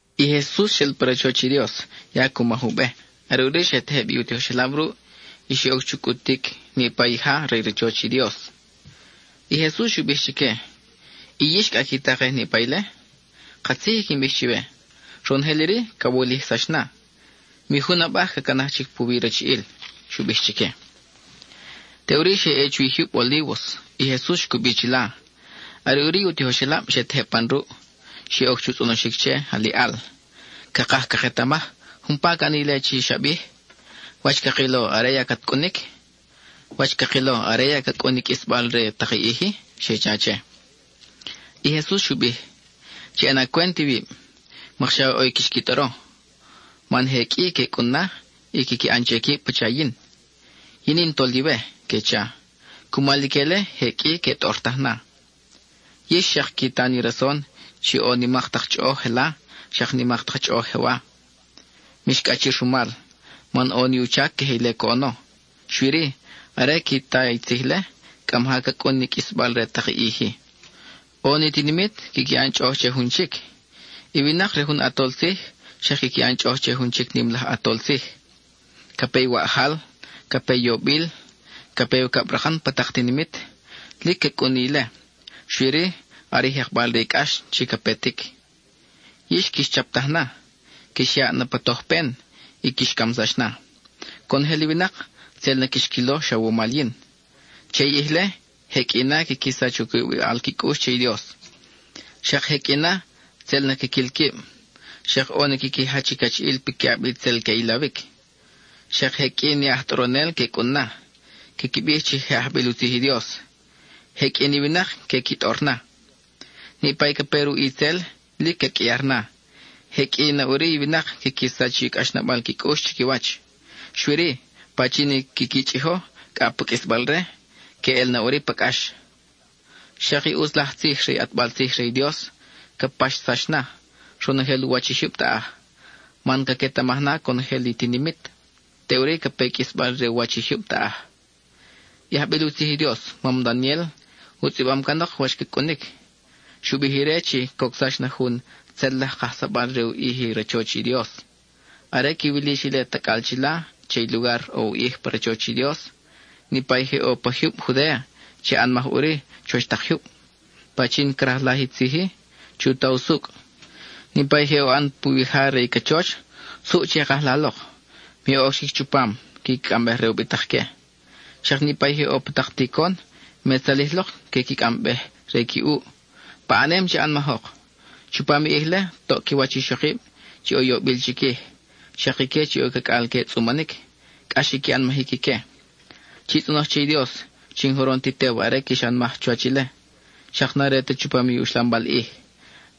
I Jesus xel pa rachoch i Dios; ya cu maj u be. Are ʼuri xe tejeb i u tijoxelab ruʼ, y xe oc chu cʼutic niʼpa i ja re i rachoch i Dios. I Jesus xu bij chique: —¿Y yix cʼa qui takej niʼpa ile? Katzij i quin bij chiwe: ronojel iri ca wulijsax na. Mi jun abaj ca canaj chic puwi i rachiʼil —xu bij chique. Teʼuri xe ʼe chuwi jyub Olívos i Jesus xcubi chila. Are ʼuri i u tijoxelab xe tejeb pan ruʼ. Xe oc chu tzʼonoxic che, aliʼal: —Cakaj caketamaj umpa ca ʼani ile chi xa bij. ¿Wach cakilo are ya cat cʼunic? ¿Wach cakilo are ya ca cʼun i qʼuisbal re tak i ʼij-i? —xe cha che. I Jesus xu bij: —Chi ʼana cwent iwib, mokxa ʼo quix qui tʼoro. Man je qʼui que cʼun na, y quiqui ʼan che quib pacha yin. “Yin in i Toliwe,” que cha; cumal ique-le, je qʼui que tʼortaj na. Yix xak qui ta ni rason chi ʼo nimak tak chʼoʼoj jela, xak nimak tak chʼoʼoj jewa. Mix cʼachir rumal, man ʼo ni u chac queje ile coʼono; xui-ri, are qui ta i tzij-le, cʼa maja ca cʼun ni qʼuisbal re tak i ʼij-i. ʼO ni tinimit quiqui ʼan chʼoʼoj che jun chic. I winak re jun ʼatol tzij xak quiqui ʼan chʼoʼoj che jun chic nim laj ʼatol tzij. Ca pe waʼjal, ca pe yobil, ca pe i ucabrakan pa tak tinimit. Lic ca cʼun na ile, xui-ri xa are i jekbal re i cʼax chi ca petic. Yix quix chaptaj na, quix yaʼ na pa tojpen, y quix camsax na. Conojel i winak tzel na quix quilo xa wumal yin. Che i ʼij-le, je qʼui na quiqui sach u cubibal qui cʼux che i Dios; xak je qʼui na, tzel na quiquil quib; xak ʼo ni quiqui jach i cachiʼil piquiʼab i tzel que ʼilawic. Xak je qʼui ni aj tʼoronel que cʼun na, quiqui bij chi je ajbil u tzij i Dios; je qʼui ni winak que qui tʼor na. Niʼpa i ca pe ruʼ itzel lic ca qʼuiar na, je qʼui na ʼuri i winak quiqui sach i cʼaxnabal qui cʼux chiquiwach. Xui-ri, pachin i quiqui chʼijo cʼa pa qʼuisbal-re, que ʼel na ʼuri pa cʼax. Xak i ʼutz laj tzij re i ʼatbal tzij re i Dios ca paxsax na, ronojel u wach i jyub taʼaj, man caquetamaj na conojel i tinimit; teʼuri ca pe i qʼuisbal re u wach i jyub taʼaj. I ajbil u tzij i Dios, mam Daniel, u tzʼibam canok wach ca cʼunic; xu bij ire chi cocsax na jun tzel laj kajsabal re u ʼij i rachoch i Dios. Are quiwil yix ile tacʼal chila che i lugar ʼo u ʼij pa rachoch i Dios, niʼpa i je ʼo pa jyub Judéa, che ʼanmaj ʼuri chuwa tak jyub. Pachin crajlaj i tzij-i, chu ta usucʼ. Niʼpa je ʼo ʼan puwija re i cachoch, suʼ che kaj la lok; me oc chic chupam, quiqui cʼambej re ubitak-que. Xak niʼpa i je ʼo pa tak ticon, me tzalij lok que qui cʼambej re qui ʼuʼ. ¡Paʼanem che ʼanmajok! Chupam i ʼij-le, toʼ qui wach ixokib chi ʼo i yobil chiquij, xak ique chi ʼo cacʼal que tzʼumanic, cʼax i qui ʼanmajic ique. Chi tzʼonoj che i Dios chi n-joron ti tew are quix ʼanmaj chuwach ile, xak n-are ta chupam i uxlambal ʼij.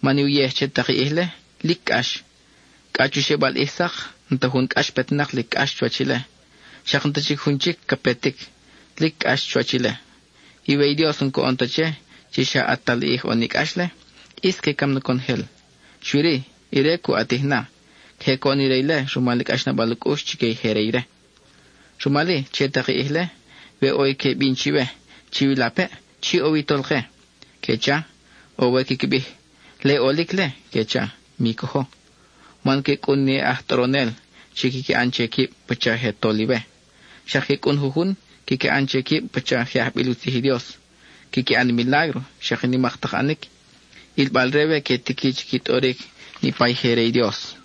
Man i uyej che tak i ʼij-le, lic cʼax. Cʼa chu xebal ʼij sak, n-ta jun cʼax petnak lic cʼax chuwach ile; xak n-ta chic jun chic ca petic, lic cʼax chuwach ile. Y we i Dios n-coʼon ta che, chi xa ʼatal ʼij ʼo ni cʼax-le, ʼis que cam na conojel. Xui-ri, ire cu ʼatij na; queje coʼon ire ile rumal i cʼaxnabal u cʼux chique i je re ire. Rumal-i, che tak i ʼij-le, we ʼo i que bin chiwe: “Chiwilapeʼ, chi ʼo wi i Tolke,” que cha, o we quiqui bij: “Le i ʼolic-le,” que cha, mi cojo. Man que cʼun ni aj tʼoronel chi quiqui ʼan che quib pacha je toliwe, xak que cʼun jujun quiqui ʼan che quib pacha je ajbil u tzij i Dios. Quiqui ʼan ni milágro, xak nimak tak ʼanic, ʼilbal-re we que tiqui chi qui tʼoric niʼpa i je re i Dios.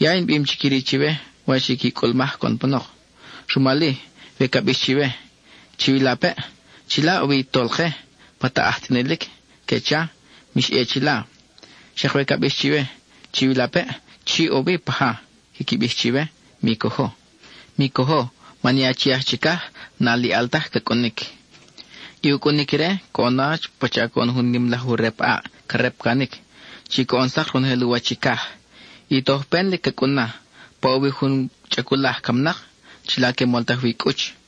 Ya in bim chic iri chiwe wach i qui cʼulmaj coʼon panok. Rumal-i, we ca bix chiwe: “Chiwilapeʼ chila ʼo wi i Tolke pa taʼaj tzʼinilic,” que cha, mix ʼe chila; xak we ca bix chiwe: “Chiwilapeʼ chi ʼo wi paja,” quiqui bij chiwe, mi cojo. Mi cojo, man i Achi aj Chicaj n-aliʼal taj ca cʼunic. I u cʼunic ire coʼono pacha coʼon jun nim laj u rep ʼaʼ ca repcanic, chi coʼon sak ronojel u wach i caj. (I tojpen lic ca cʼun-na.) Pa ʼo wi jun chʼaculaj camnak, chila que moltaj wi i cʼuch.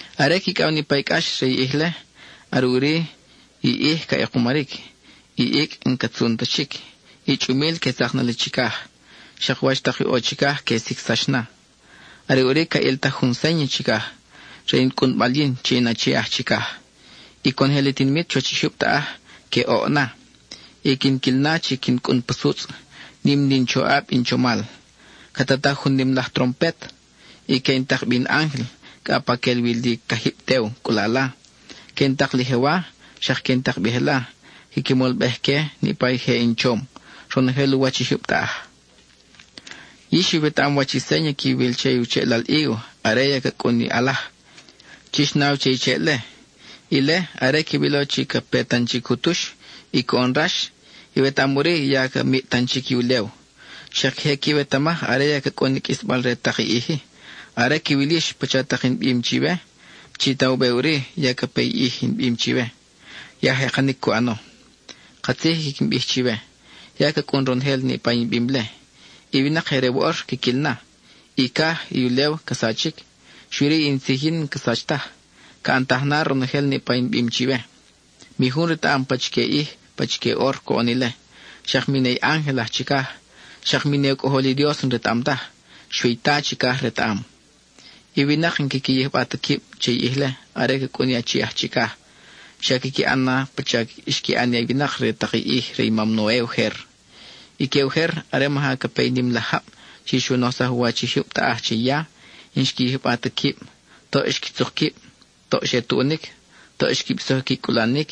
Are quicʼaw niʼpa i cʼax re i ʼij-le, are ʼuri i ʼij ca ʼekumaric; i icʼ n-ca tzun ta chic; i chʼumil que tzak na li chicaj; xak wach tak ʼo chicaj que sicsax na. Are ʼuri ca ʼiltaj jun séña chicaj, re in cʼunbal yin chi in Achi aj Chicaj. Y conojel i tinimit chuwach i jyub taʼaj que oʼ na. Y quin quil na chi quin cʼun pa sutzʼ, nim na in choʼab, in chomal. Ca tataj jun nim laj trompet, y que in tak bi in ángel cʼa pa que ʼel wi li i cajib tew cʼulala; que in tak li jewa, xak que in tak bi jela, quiqui molbej-que niʼpa i je in chom, ronojel u wach i jyub taʼaj. Yix iwetaʼam wach i séña quiwil che u cheʼlal hígo are ya ca cʼun i ʼalaj; chix naw che i cheʼ-le. Ile, are quiwilo chi ca pe tan chic u tux, y coʼon rax, iwetaʼam ʼuri ya ca miʼ tan chic i ulew. Xak queje quiwetamaj are ya ca cʼun i qʼuisbal re tak i ʼij-i. Are quiwil yix pacha tak in bim chiwe, chi ta u be ʼuri ya ca pe i ʼij in bim chiwe; ya jekanic cu ʼano. Katzij i quin bij chiwe, ya ca cʼun ronojel niʼpa in bim-le; i winak je re woʼor quiquil na. I caj, i ulew ca sachic, xui-ri in tzij yin n-ca sach taj, ca ʼantaj na ronojel niʼpa in bim chiwe. Mi jun retaʼam pachique ʼij, pachique ʼor, coʼon ile. Xak mi ne i ángel aj chicaj, xak mi ne u Cʼojol i Dios n-retaʼam taj; xui i Ta chicaj retaʼam. I winak n-quiqui yijba ta quib che i ʼij-le are ca cʼun i Achi aj Chicaj. Xa quiqui ʼan na pacha xqui ʼan i winak re tak i ʼij re i mam Noe ujer. Ique ujer, are maja ca pe i nim laj jab chi xu nojsaj u wach i jyub taʼaj che i ya, n-xqui yijba ta quib. Toʼ xqui tzuk quib, toʼ xe tuʼunic, toʼ xqui bisoj i qui cʼulanic;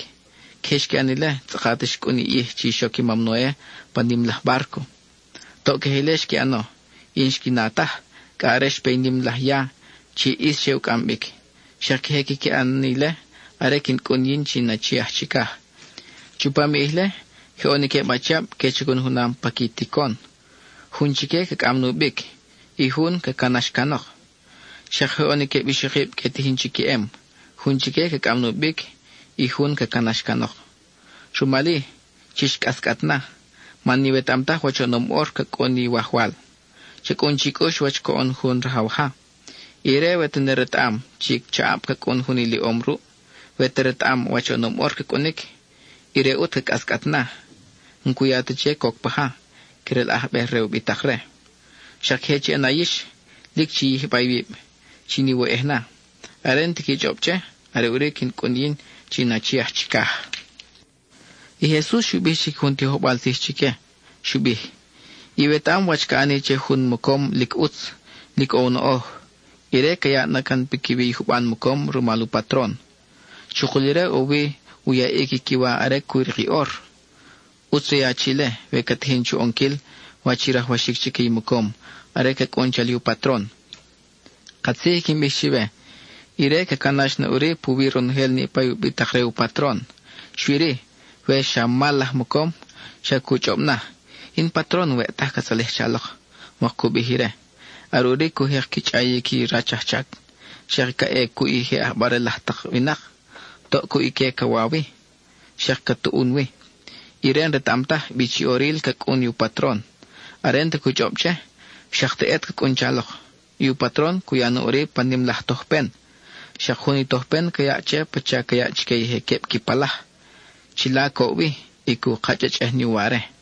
queje xqui ʼan ile tzʼakat xcʼun i ʼij chi xoc i mam Noe pa nim laj bárco. Toʼ queje ile xqui ʼano, y n-xqui na taj, cʼa are xpe i nim laj ya chi ʼis xe u cʼam bic. Xak queje quiqui ʼan na ile are quin cʼun yin chi in Achi aj Chicaj. Chupam i ʼij-le, je ʼo ni queb achiab, que chacun junam pa qui ticon; jun chique ca cʼam nubic; i jun, ca canax canok. Xak je ʼo ni queb ixokib que tijin chi queʼem. Jun chique ca cʼam nubic; i jun ca canax canok. Rumal-i, chix cʼascʼat na, man n-iwetaʼam taj wach oʼonom ʼor ca cʼun i Iwajwal. Cha cʼun chi cʼux wach coʼon jun rajaw ja. Ire we te retaʼam chi chaʼab ca cʼun jun iliʼom ruʼ, we te retaʼam wach oʼonom ʼor ca cʼunic, ire ʼut ca cʼascʼat na. N-cu ya ta che coc paja, crelʼajbej re ubitak-re. Xak queje chi ʼana yix, lic chi yijba iwib chin iwoyʼej na; are n-ti qui chʼob che, are ʼuri quin cʼun yin chi in Achi aj Chicaj. (I Jesus xu bij chic jun tijojbal tzij chique. Xu bij): —Iwetaʼam wach ca ʼani che jun mocom lic ʼutz, lic ʼo u noʼoj. Ire ca yaʼ na can piquiwi i juban mocom rumal u patron. Chukul ire ʼo wi u yaʼic i qui wa are cu rik i ʼor. ʼUtz re i achi-le, we ca tijin chu ʼonquil wach i rajwaxic chique i mocom are ca cʼun chali i u patron. Katzij i quin bij chiwe, ire ca canax na ʼuri puwi ronojel niʼpa i ubitak-re u patron. Xui-ri, we xa mal laj mocom, xa cu chʼob na: “In patron, n-weʼ taj ca tzalij chalok,” mok cu bij ire. Are ʼuri cu jek qui chʼayic i rach ajchac, xak ca ʼe cuʼ i je ʼabarel laj tak winak: toʼ cuʼ ique ca wa wi, xak ca tuʼun wi. Ire n-retaʼam taj bi chi ʼoril ca cʼun u patron. Are n-ta cu chʼob che, xak teʼet ca cʼun chalok. I u patron cu ya na ʼuri pa nim laj tojpen. Xak jun i tojpen ca yaʼ che pacha ca yaʼ chique i je queb qui palaj. Chila coʼ wi, y cu kachʼachʼej ni uware.